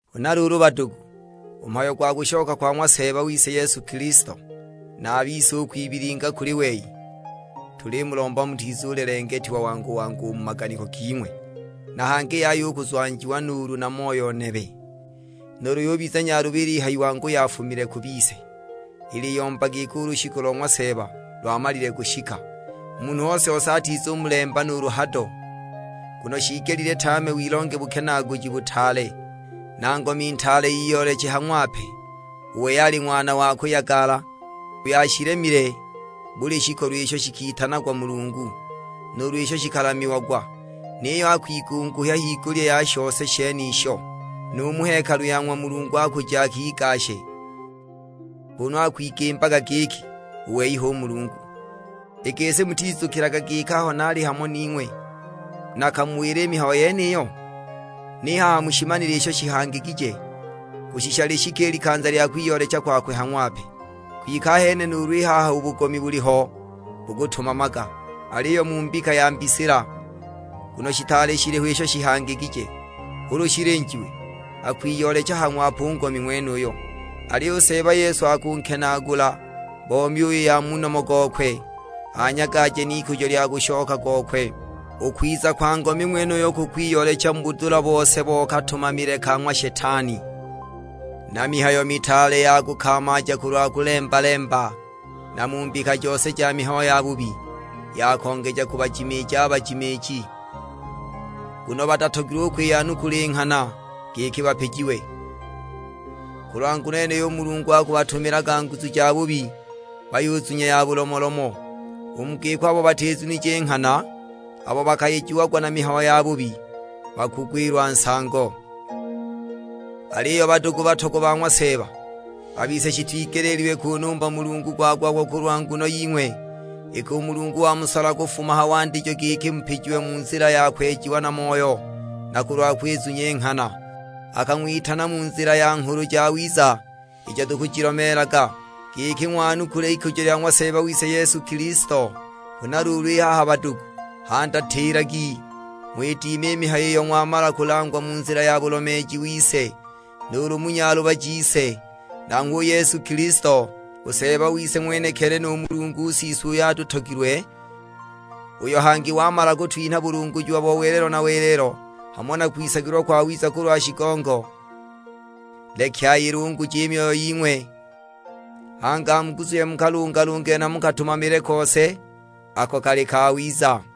Huna luulu badugu, u mhayo gwa kushoka kwa ng'wa Seeba wise Yesu Kilisto, na a bise u kwibilinga kuli wei, tulimulomba mutizulelengetiwa wangu-wangu u mu maganiko ging'we. Na hangi yaya u kuzwanjiwa nuulu na moyo nebe. Nuulu ikabiza mihayo ya mbika ki, nuulu yubiza nyaluba ilihayiwa angu yafumile ku bise, iliyomba giki u lushiku lo ng'wa Seeba lwamalile kushika! Munhu ose-ose atizumulemba nuulu hado; nguno shiigelile tame wilonge bukenaaguji butaale, na ngomi ntaale iyooleche ha ng'wape. U wei ali ng'wana wa kuyagala, uyo ashilemile buli shikolo isho shikitanagwa mulungu, nuulu isho shikalamiagwa. Niyo akwigunguhya higulya ya shose shenisho. Nu mu hekalu ya ng'wa Mulungu akuja akigashe, kunu akwigimbaga giki u wei hu Mulungu! I gisi mutizukilaga giki aho naali hamo ning'we nakamuwila i mihayo yeniyo? Ni haha mushimanile isho shihangigije, kushisha lishike i likanza lya kwiyoolecha kwakwe ha ng'wape. Kwike ahene nuulu i haha u bugomi buliho bukutumamaga; aliyo mu mbika ya mbisila, nguno shitaali shiliho isho shihangigije. Ulu shilinjiwe, akwiyoolecha ha ng'wape u ngomi ng'wenuyo. Aliyo u Seeba Yesu akunkenaagula bo myuyi ya mu nomo gokwe, anyagaje n'ikujo lya kushoka gokwe. U kwiza kwa ngomi ng'wenuyo kukwiyoolecha mu budula bose bo katumamile ka ng'wa Shetani, na mihayo mitaale ya kukamaaja kulwa kulemba-lemba; na mu mbika jose ja mihayo yabubi, ya kongeja kubajimiija a bajimiiji, nguno batatogilwe u kwiyanukula i nghana giki bapijiwe. Kulwa nguno yeniyo u Mulungu akubatumilaga nguzu jabubi, bayuzunya ya bulomolomo. U mu giko abo batizunije i nghana, abo bakayejiagwa na mihayo yabubi, bakugwilwa nsango. Aliyo badugu batogwa ba ng'wa Seeba, a bise shitwigeleelilwe kunumba Mulungu gwa-gwa-gwa kulwa nguno ying'we, iki u Mulungu wamusola kufuma ha wandijo giki mupijiwe mu nzila ya kwejiwa na Moyo, na kulwa kwizunya i nghana. Akang'witana mu nzila ya Nghulu Jawiza ijo tukujilomeelaga, giki ng'wanukule ikujo lya ng'wa Seeba wise Yesu Kilisto. Huna luulu i haha badugu, handatilagi, ng'widime i mihayo iyo ng'wamala kulangwa mu nzila ya bulomeeji wise, nuulu mu nyaluba jise. Nanghwe u Yesu Kilisto, u Seeba wise ng'wenekili nu Mulungu Siswe uyo atutogilwe, uyo hangi wamala kutwinha bulungujiwa bo welelo na welelo, hamo na kwisagilwa kwawiza kulwa shigongo, leki ayilunguje i myoyo ying'we, hangi amuguzuhye mu kalungalungile na mu katumamile kose, ako kali kawiza.